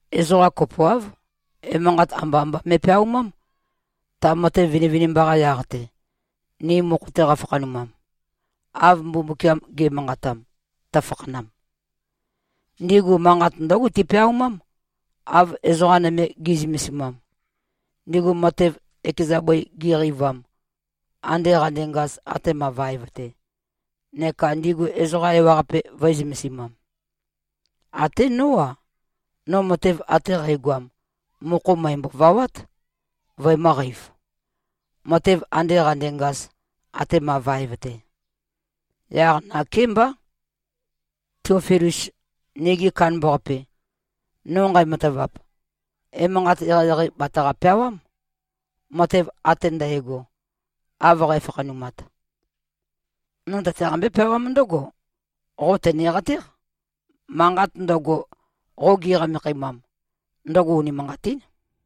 Ezoqa kopoáv, emanqat amba-amba me꞉peaumám, ta matev vinivinimba-qa yaq-te, ni mokho-te qafakhanumam, av Mbumbukiam ge꞉manqatam, tøfakhanam. Ndigu manqat ndǿgo tipeaumám, av ezoqa nøme gi꞉zømesimam, ndigu matev ekeza bøi gi꞉qeivam, ande qandengaz atema vaev-te, neka ndigu ezoqa ewaqape vø̄e-zømesimam. Até nó-a, no matev ate qægoam, mokho mø̀embo-vawát, vøemø̄qeiv, matev ande qandengaz, atema vaev-te. Yaq nakémbá, Tiofilus, nigi kandambaqape, no nqæmatavap, emanqat eqeieqei bataqa-peawám, matev ate ndægo, av qæfakhanumat. No tøtaqambé-peawám ndǿgo, qo tøneqatéq, manqat ndøgo, qo gi꞉qamekhæmam, ndøgo unimanqatín.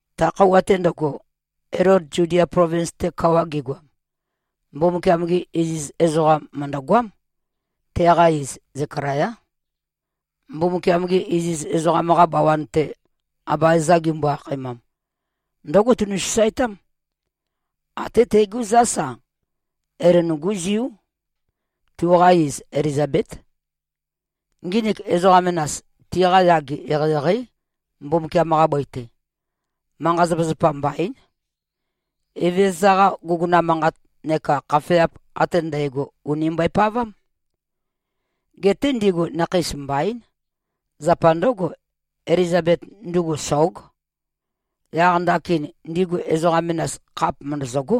Ta khøuwa-te ndøgo, Elod Zudia plovins-te kawa gegoam, Mbumbukiam-ge iziz ezoqam mø̀ndøgoám. Teqa iz Zekalayá. Mbumbukiam-gi iziz ezoqam-qa bawan-te, Abaeza gimbo-akhaemam, ndǿgo tunu꞉-sasaetám. Até tegú zás-a, Elon-gú ziú. Tuqa iz, Elizabét. Nginik ezoqa menas, tiqa yage eqeieqeí, Mbumbukiam-qa bøi-te. Manqa-zapazapa mbaín. Evezøza-qa guguna manqat neka khafeap ate ndægo ùni mbøepavám. Geté ndigu nakheis mbaín. Zapa ndǿgo, Elizabet ndugu, sóg. Yaq ndakin ndigu ezoqa menas, khap mø̀ndøzøgó.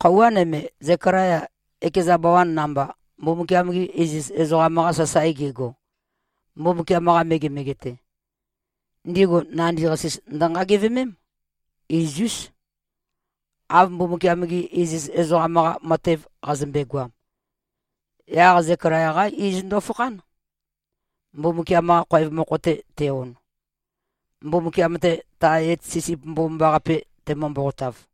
Khøuwa nøme, Zekalaya ekeza bawan namba, Mbumbukiam-ge iziz ezoqam-qa sasae gego, Mbumbukiam-qa megemege-te, ndigu nandi-qasis ndønqagevemém, iz-ús, av Mbumbukiam-gi iziz ezoqam-qa matev qazømbe-goam. Yaq Zekalaya-qá iz ndøfakhán, Mbumbukiam-qa khoev mokho-te te-on, Mbumbukiam-te tae et sisip mbomambaqape temø-mboqotav.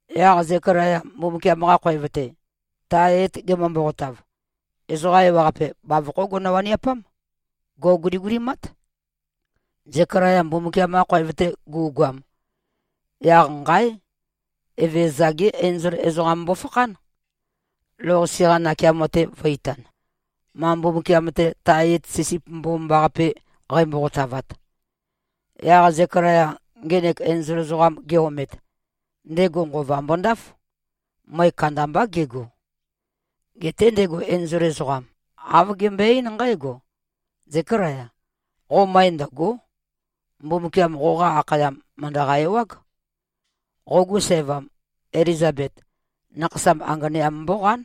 Yaq Zekalaya Mbumbukiam-qa khoev-te, tae et gemø-mboqotav, ezoqa ewaqape, bavokhó gono-waniapám. Gò꞉guligulimát. Zekalaya Mbumbukiam-qa khoev-te gu꞉goam, yaq nqáe! Evezøza-gé enzol ezoqam mbofakhán, lou-qase-qa nakeamo-te vø̄-itan, ma Mbumbukiam-te, tae et sisip mbomambaqape qæmboqotavat. Yaq Zekalaya ngenek enzol ezoqam ge-omet, ndego nqova mbondáf. Møe kandambá gego. Geté ndego enzol ezoqam, āv gembøe-eín nqǽgo, “Zékalaya. Qo møe ndø̀go᷄. Mbumbukiam qoqa akhayam, mø̀ndøqa-ewág. Qogu sævam, Elizabet, nakhasam anganeam mbóqán.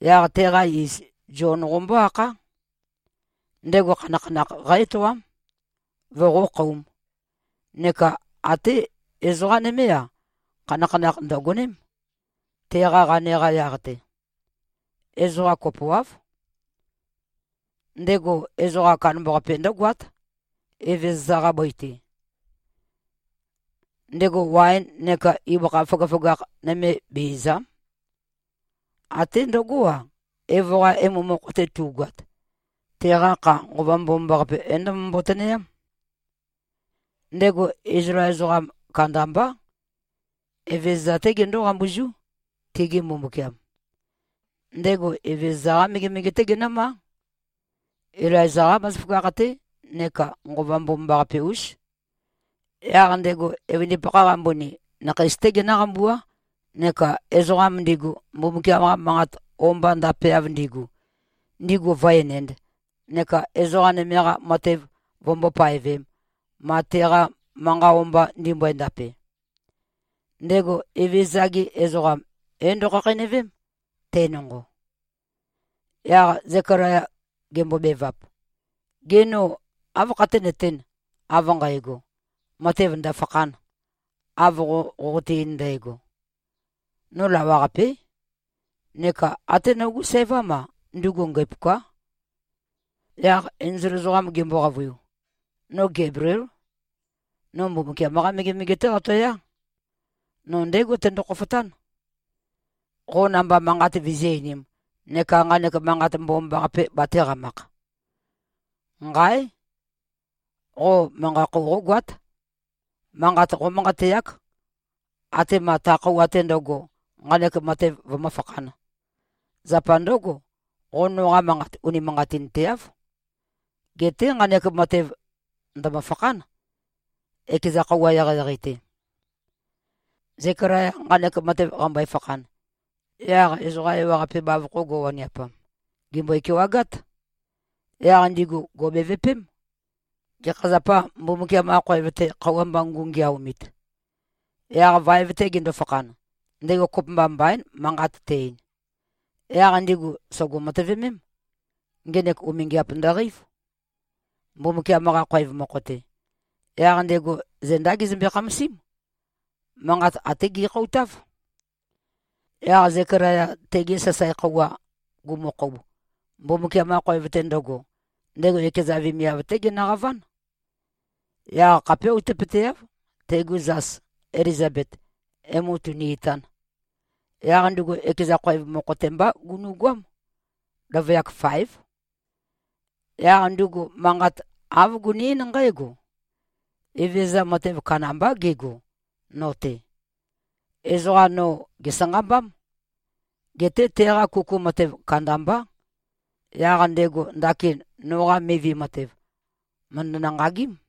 Yaq teqa iz Zion qombó-akhá. Ndego khanakhanakh qá-etoám, voqókhōum. Neka até ezoqá nømé-a, khanakhanakh ndø̀goném, teqa qane-qa yaq-te. Ezoqa kopoáv. Ndego ezoqam kandambaqape ndǿgoát, Evezøza-qa bøi-te. Ndego waen neka ibøkha føgøføgakh nøme be-ìza᷄m. Até ndøgó-a, evo-qa emu mokho-te tu꞉goat, teqa kha Nqova Mbomambaqape, é-ndømømbo-tønøyám. Ndego Izlael ezoqa kandambá, Evezøza-té gendó-qambuzú, tigi Mbumbukiam. Ndego Evezøza-qá megemege-té genǿmá. Ilaiza-qá bazaføgakh-té neka Nqova Mbomambaqape-ús. Yaq ndego evøndipakha-qa mbøni, nakheis-té genǿqambuá neka ezoqam ndigu, Mbumbukiam-qa manqa o-mba ndapeav ndigu, ndigu vǿ-enēnd neka ezoqa nøme-qa matev vømbó-paevēm, ma teqa manqa o-mba ndimbøe-ndape. Ndego Evezøza-gi ezoqam é-ndo꞉khakheinøvém, te nonqo.” Yaq Zekalaya gembobevap, “Gê, no áv khaténøtēn, av nqægo, matev ndø̀fakhān, av qo qoqote-ein ndægo? No lawaqapé. Neka até nogú sævám-a, ndugu ngæpuká.” Yaq enzol ezoqam gembo-qavøiu, “No Gebliél. No Mbumbukiam-qá megemege-té qatoyá. No ndégo tendo-khofotán, qo namba manqat vizí-einīm neka nqanek manqat mbomambaqape batēqamakh. Nqáe! Qo manqa-khou qógoát. Manqat qómanqateák, atema ta khøuwa-te ndøgo, nqanek matev vømǿfakhān. Zapa ndǿgo, qo noqa manqat unimanqatinteáv. Geté nqanek matev ndø̀mø-fakhán, ekeza khøuwa eqeieqei-te.” Zekalaya nqanek matev qambøe-fakhan, yaq ezoqa ewaqape bavokho go꞉waniapam, gèmbøe-kewagát. Yaq ndigu gò꞉bevøpém, gekha zapâ Mbumbukiam-qa khoev-te khøuwa mba ngu꞉ngeaomit? Yaq vaev-te gendo-fakhan, ndego kopømba mbaín, manqat te-ein. Yaq ndigu sògo-matøvemém, ngenek umingiap ndøqeív, Mbumbukiam-qa khoev mokho-te. Yaq ndego zendá gezømbe-khamasím. Manqat até gekhoutáv. Yaq Zekalaya tege sasae khøuwa gumukhoub, Mbumbukiam-qa khoev-te ndøgo, ndego ekeza vemiav-té genøqaván. Yaq khapé outøpøteáv, tegu zas Elizabet, emu tūnī-ītān. Yaq ndugu ekeza khoev mokho-te mbá gunu꞉goám. Løvøyak faév. Yaq ndugu manqat āv guni-eín nqǽgo, “Evezøza matev kandambá gego, no-te. Ezoqa no gèsanqambám. Geté teqa kuku matev kandambá. Yaq ndego ndakin noqa mivi matev, mø̀ndønø-nqagím.”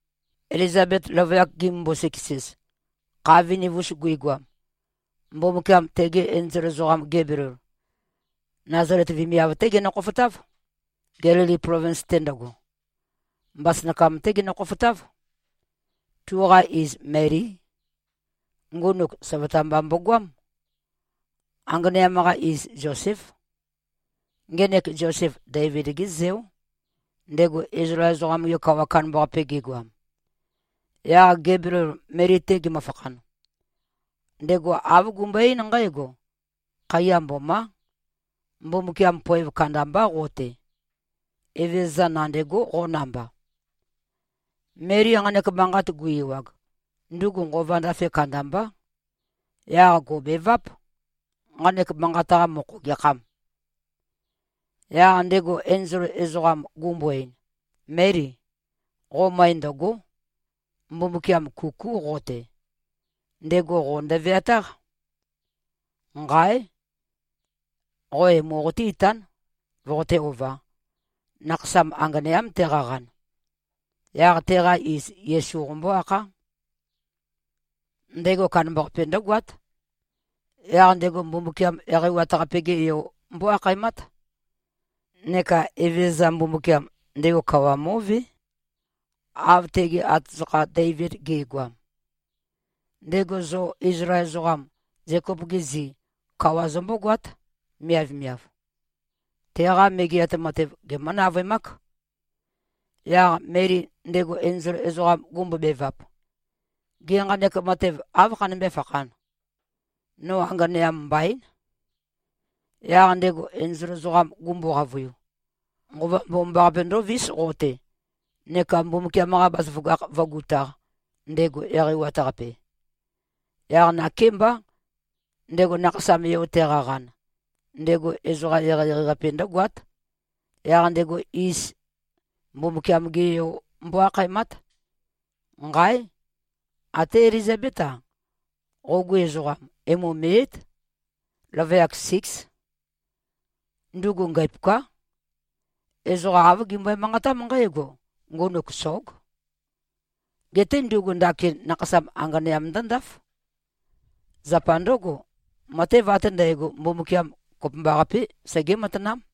Elizabet løvøyak gimømbo-siks-ez, kha viniv-us guigoam, Mbumbukiam tege enzol ezoqam Gebliel, Nazalet vemiav-té genø-khofotáv, Gelili plovins-te ndøgo. Mbasønakam-té genø-khofotáv. Tuqa iz, Melí. Ngunuk søvøta mba mbogoám. Anganeam-qa iz Zoséf. Ngenek Zosef, Deivid-gé zeó, ndego Izlael ezoqam-ge kawa kandambaqape gegoam. Yaq Gebliel Meli-te gemøfakhan, ndego āv gumbøe-eín nqǽgo, “Khaiya mbomá. Mbumbukiam poev kandambá qo-te. Evezøza nandêgó, qo namba.” Meli nqanek manqat gu-ewag, ndugu nqova ndafe kandambá. Yaq gò꞉beváp, nqanek manqat-qa mokho gekhām? Yaq ndego enzol ezoqam gumbo-ein, “Méli. Qo møe ndø̀go᷄. Mbumbukiam kukú qo-te. Ndego qo ndøveatáq. Nqáe! Qo emu qoté-itán, voqoté-ovā. Nakhasam anganeám teqaqan. Yaq teqa iz Yesu qombó-akhá. Ndego kandambaqape ndǿgoát. Yaq ndego Mbumbukiam Eqeiwat-Qape-ge Yo mbó-akhaemát. Neka Evezøza Mbumbukiam, ndego kawa mó꞉vé, av tege atazøkha Deivid ge꞉goam. Ndego zo Izlael ezoqam, Zekop-gi zi, kawa zømbógoát, miavmiav. Teqa Megeat Matev gemǿ-navøemák.” Yaq Meli ndego enzol ezoqam gumbobevap, “Gê, nqanek matev áv khanømbé-fakhān? No anganeam mbaín.” Yaq ndego enzol ezoqam gumbo-qavøiu, “Nqova Mbomambaqape ndóvís qo-te, neka Mbumbukiam-qa bazaføgakh vǿgutāq, ndego Eqeiwat-Qape. Yaq nakémbá, ndego nakhasam-yo teqaqan, ndego ezoqam eqeieqei-qape ndǿgoát, yaq ndego iz Mbumbukiam-ge Yo mbó-akhaemát. Nqáe! Até Elizabét-a, qogu ezoqam, emu me꞉yǽt. Løvøyak síks. Ndugu ngæpuká. Ezoqa āv gimbøe-manqatám nqǽgo, ngunuk sóg. Geté ndugu ndakin nakhasam anganeam ndǿndáf. Zapa ndǿgo, matev ate ndægo, Mbumbukiam kopømbaqapé, segé-matanám.”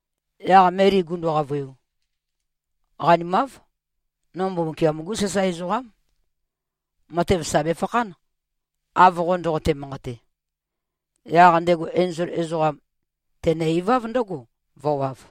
Yaq Meli gundu-qavøiu, “Qanimáv. No Mbumbukiam-gú sasae ezoqám. Matev sà befakhán, av qo ndoqote-manqate.” Yaq ndego enzol ezoqam, tenø-iváv ndǿgo, vø̄wav.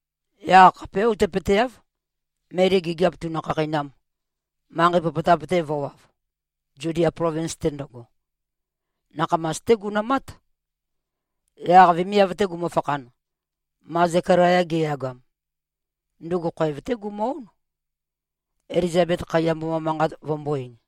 Yaq khapé outøpøteáv, Meli gigiap tūnø̄-khākhēinām, manqei popotap-te vø̄wav, Zudia plovins-te ndøgo. Nakhamas-té gunømát. Yaq vemiav-te gumøfakhan, ma Zekalaya geyagam, ndugu khoev-té gumø-ón, Elizabet khaiya mboma manqat vømbō-ein.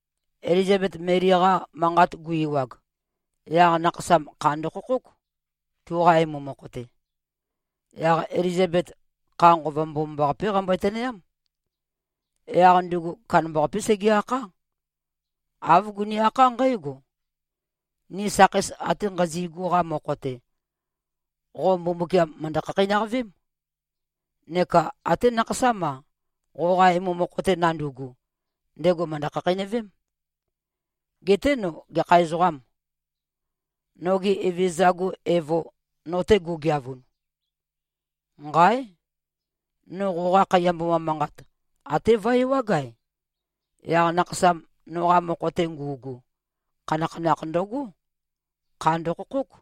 Elizabet Meli-qa manqat gu-ewag, yaq nakhasam kha ndøkhokhók, tuqa emu mokho-te. Yaq Elizabet, kha Nqova Mbomambaqapé qambøe-tønøyám. Yaq ndugu kandambaqapé sege-akhá. Āv guni-akhá nqǽgo, “Ni sakheis ate nqazi꞉gu-qa mokho-te, qo Mbumbukiam mø̀ndø-khakheinøqavém. Neka até nakhasám-a, qoqa emu mokho-te nandu꞉gu, ndego mø̀ndø-khakheinøvém. Geté no gekha ezoqâm, noge Evezøza-gu evo, no-te gugeavun? Nqáe! No qoqa khaiya mboma manqat até vøe-ewág-ae, yaq nakhasam noqa mokho-te ngu꞉gu, khanakhanakh ndøgó. Kha ndøkhokhók.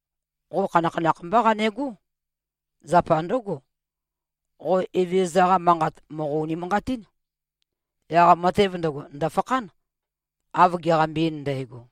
Qo khanakhanakh mbá qanegó. Zapa ndǿgo, qo Evezøza-qa manqat mòqo-unimanqatín. Yaq matev ndøgo ndø̀fakhán, av geqambe-ein ndægo.”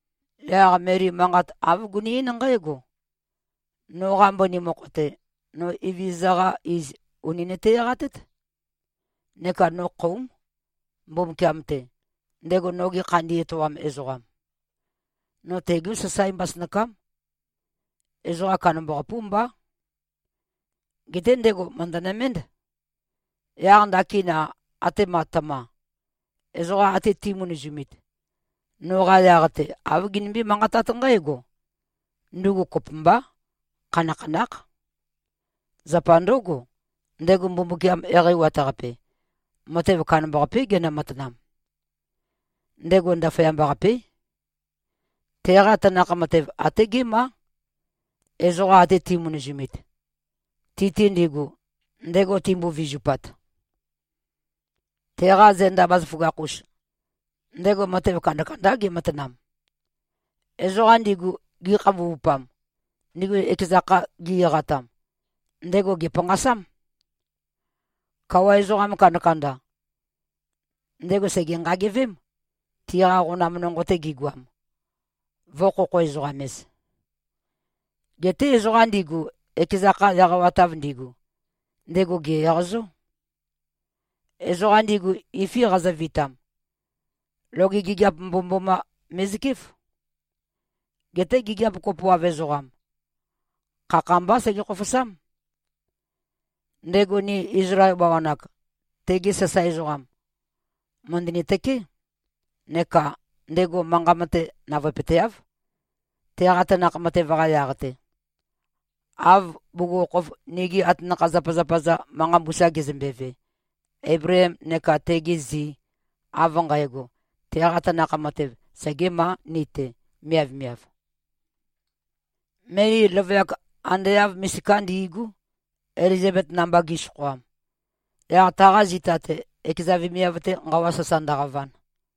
Yaq Meli manqat āv guni-eín nqǽgo, “Noqa mbøni mokho-te, no Evezøza-qa iz ùni nøte-eqatét. Neka no khóum, Mbumbukiam-te, ndego noge khandi etoam ezoqam. No tegú sasae mbasønakám. Ezoqa kandambaqapú mbá. Geté ndego mø̀ndønøménd. Yaq ndakin-a, atema tøma, ezoqa ate ti꞉mønøzumit, noqa yaq-te āv ginømbé-manqatát nqǽgo, ‘Ndugu kopømbá, khanakhanákh.’ Zapa ndǿgo, ndego Mbumbukiam Eqeiwat-Qape, matev kandambaqapé genø-matanam. Ndego ndaføyamba-qapé. Teqa tanakh matev até gémá, ezoqa ate ti꞉mønøzumit, ti-te ndigu, ndego timbo-vizupat. Teqa zenda bazaføgakh-us, ndego matev kandakandá ge꞉matanam. Ezoqa ndigu gikhambuvupam, ndigu ekeza kha gi-eqatam, ndego gèpanqasám. Kawa ezoqa kandakanda, ndego sège-nqagevém, tiqa qonam nonqo-te gigoam, vø̄-khokho-ezoqam-ez. Geté ezoqa ndigu, ekeza kha eqawatav ndigu, ndego gè-eqazó. Ezoqa ndigu, ifi qazøvitam, loge gigiap mbomømboma me꞉zøkéf. Geté gigiap kopoav ezoqam, khakha-mbá sege-khofosám. Ndego ni Izlael bawan-ak, tegi sasae ezoqam, mø̀ndøni-tøké, neka ndego manqa mate navøepøteáv, teqa tanakh matev-qa yaq-te, av bugukhokhof nigi atanakha-zapazapa-za manqa mbusa gezømbeve, Eibleem neka tegi zi, av nqægo, teqa tanakh matev segēmā ni-te, miavmiāv.” Meli løvøyak ande āv misiká ndi꞉gú, Elizabet namba gi꞉søkhoam, yaq taqa zita-te, ekeza vemiav-te nqawa sasa ndøqavan.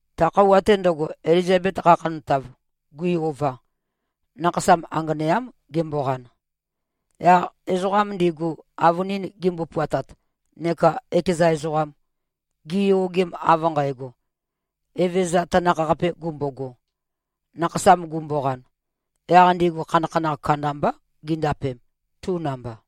Ta khøuwa-te ndøgo, Elizabet qakhantav, gui-ova, nakhasam anganeám gemboqan. Yaq ezoqam ndigu, avønin gimbo-puatat neka ekeza ezoqam, giyogem av nqægo, Evezøza tanakh-qapē gumbogo, nakhasam gumboqan, yaq ndigu khanakhanakh kandambá gindapem, tu namba.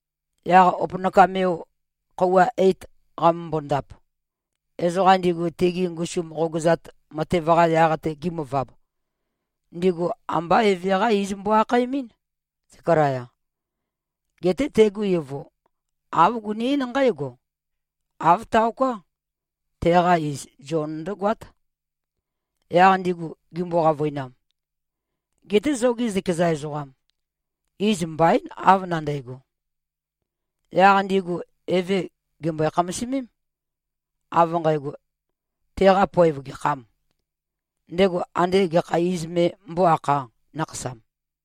Yaq opønakam-yo khøuwa eit qamømbo-ndap, ezoqam ndigu tegi ngusum qogøzat matev-qa yaq-te gimøvab, ndigu ambá eve-qá iz mbo-akhaemɨ́n, Zekalaya. Geté tegu evo, āv guni-eín nqǽgo, “Āv taoká. Teqa iz Zion ndǿgoát.” Yaq ndigu gimbo-qavøinam, “Geté zogi zøkeza ezoqam, iz mbaín, av nandægo.” Yaq ndigu eve gèmbøe-khamasimím, av nqægo, teqa poev gekhâm, ndego ande gekha iz me mbó-akhā, nakhasam.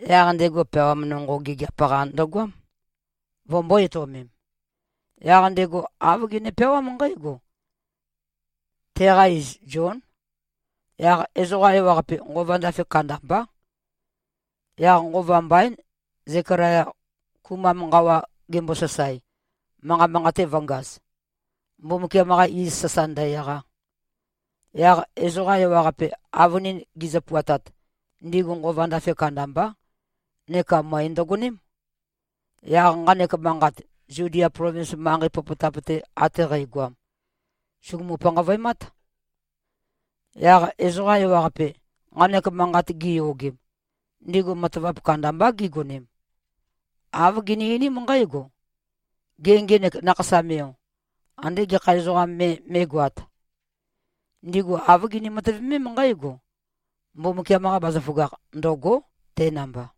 Yaq ndego peawam nonqo gigiap-qa ndøgoám, vømbō-etøomem. Yaq ndego āv gene-peawám nqǽgo, “Teqa iz Zión.” Yaq ezoqa ewaqape, nqova ndafe kandambá. Yaq nqova mbaín, Zekalaya, kumam nqawa gembosasae, manqa manqate vø̄ngaz, Mbumbukiam-qa iz sasa ndø-eqa. Yaq ezoqa ewaqape, avønin gizø-puatat, ndigu nqova ndafe kandambá, neka møe ndøgoném. Yaq nqanek manqat, Zudia plovins manqei popotap-te ate qægoam, sùgumu-panqavøemát. Yaq ezoqa ewaqape, nqanek manqat giyogem, ndigu matavap kandambá gigonem. Āv gini-einím nqǽgo, “Gê. Ngenek nakhasam-yo, andé gekha ezoqam me mé꞉goāt?” Ndigu āv gini-matøvemém nqǽgo, Mbumbukiam-qa bazaføgakh ndø̂gó, te namba.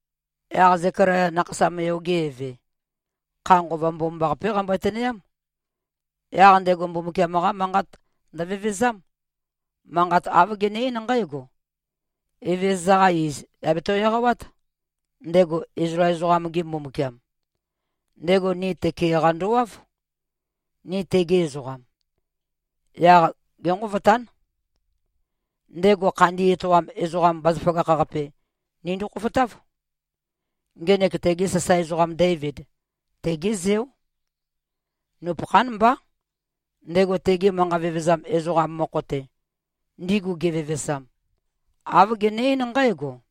Yaq Zekalaya, nakhasam-yo-ge eve, kha Nqova Mbomambaqapé qambøe-tønøyám. Yaq ndego Mbumbukiam-qá manqat ndøvevezám. Manqat āv gene-eín nqǽgo, “Evezøza-qa iz, yà beto-eqawát, ndego Izlael ezoqam-ge Mbumbukiam. Ndego ni tøke-qa ndowáv, ni tegi ezoqam. Yaq génqovotán. Ndego khandi etoam ezoqam bazaføgakh-qape nindo-khofotáv. Ngenek tege sasae ezoqam Deivid, tegé zeó. Nupøkhán mbá, ndego tegi manqa vevezam ezoqam mokho-te, ndigu gevevesam, āv gene-eín nqǽgo: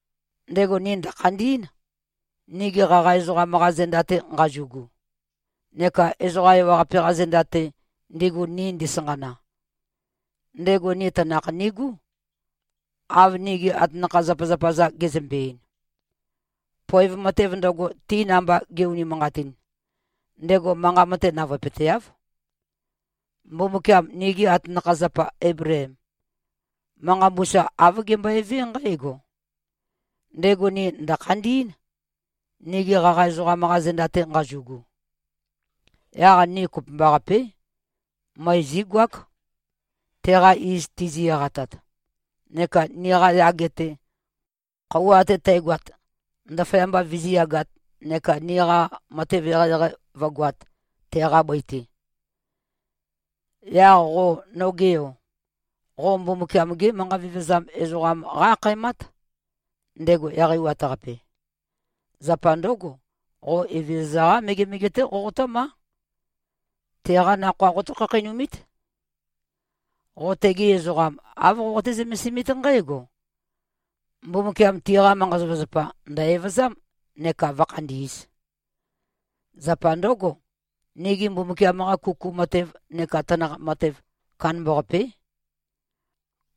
Ndego ni ndø̀khandí꞉n, nigi qaqa ezoqam-qa zenda-te nqazu꞉gu neka ezoqa ewaqape-qa zenda-te, ndigu ni ndisanqana. Ndego ni tanakh nigú, av nigi atanakha-zapazapa-za gezømbe-ein. Poev matev ndøgo, ti namba ge꞉-unimanqatin, ndego manqa mate navøepøteáv. Mbumbukiam nigi atanakha-zapa Eibleem, manqa mbusa āv gembøevé nqǽgo, ndego ni ndø̀khandí꞉n, nigi qaqa ezoqam-qa zenda-te nqazu꞉gu. Yaq ni kopømbaqapé. Møe zígoák, teqa iz tizi-eqatat, neka niqa yage-te, khøuwa ate tægoat, ndaføyamba vizíyagāt neka niqa matev eqeieqei vǿgoāt, teqa bøi-te. Yaq qo, noge yo, qo Mbumbukiam-gé manqa vevezam ezoqam qá-akhaemát, ndego Eqeiwat-Qape. Zapa ndǿgo, qo Evezøza-qá megemege-té qoqotǿmá. Teqá nakhoa qotǿ-khakheinumít. Qo tegi ezoqam, āv qoqoté-zømesimít nqǽgo: Mbumbukiam tiqa manqa-zapazapa ndø̀-evøzám neka vǿkhandī꞉z. Zapa ndǿgo, nigi Mbumbukiam-qa kuku matev neka tanakh matev kandambaqapé.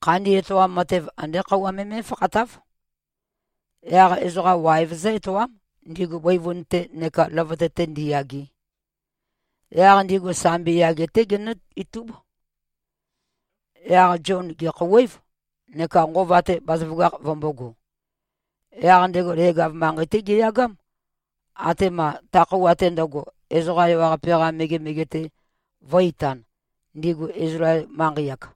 Khandi etoam matev andé khøuwa me mé꞉fakhatáv. Yaq ezoqa waev zǿ-etoám, ndigu bøivun-te neka løvøte-te ndiyage. Yaq ndigu sambi yage-té genǿ-itúb.” Yaq Zion gèkhouwév, neka nqova-te bazaføgakh vømbōgo. Yaq ndego leg-av manqei-té geyagám, atema ta khøuwa-te ndøgo, ezoqa ewaqape-qa megemege-te vō꞉-itan, ndigu Izlael manqei-ak.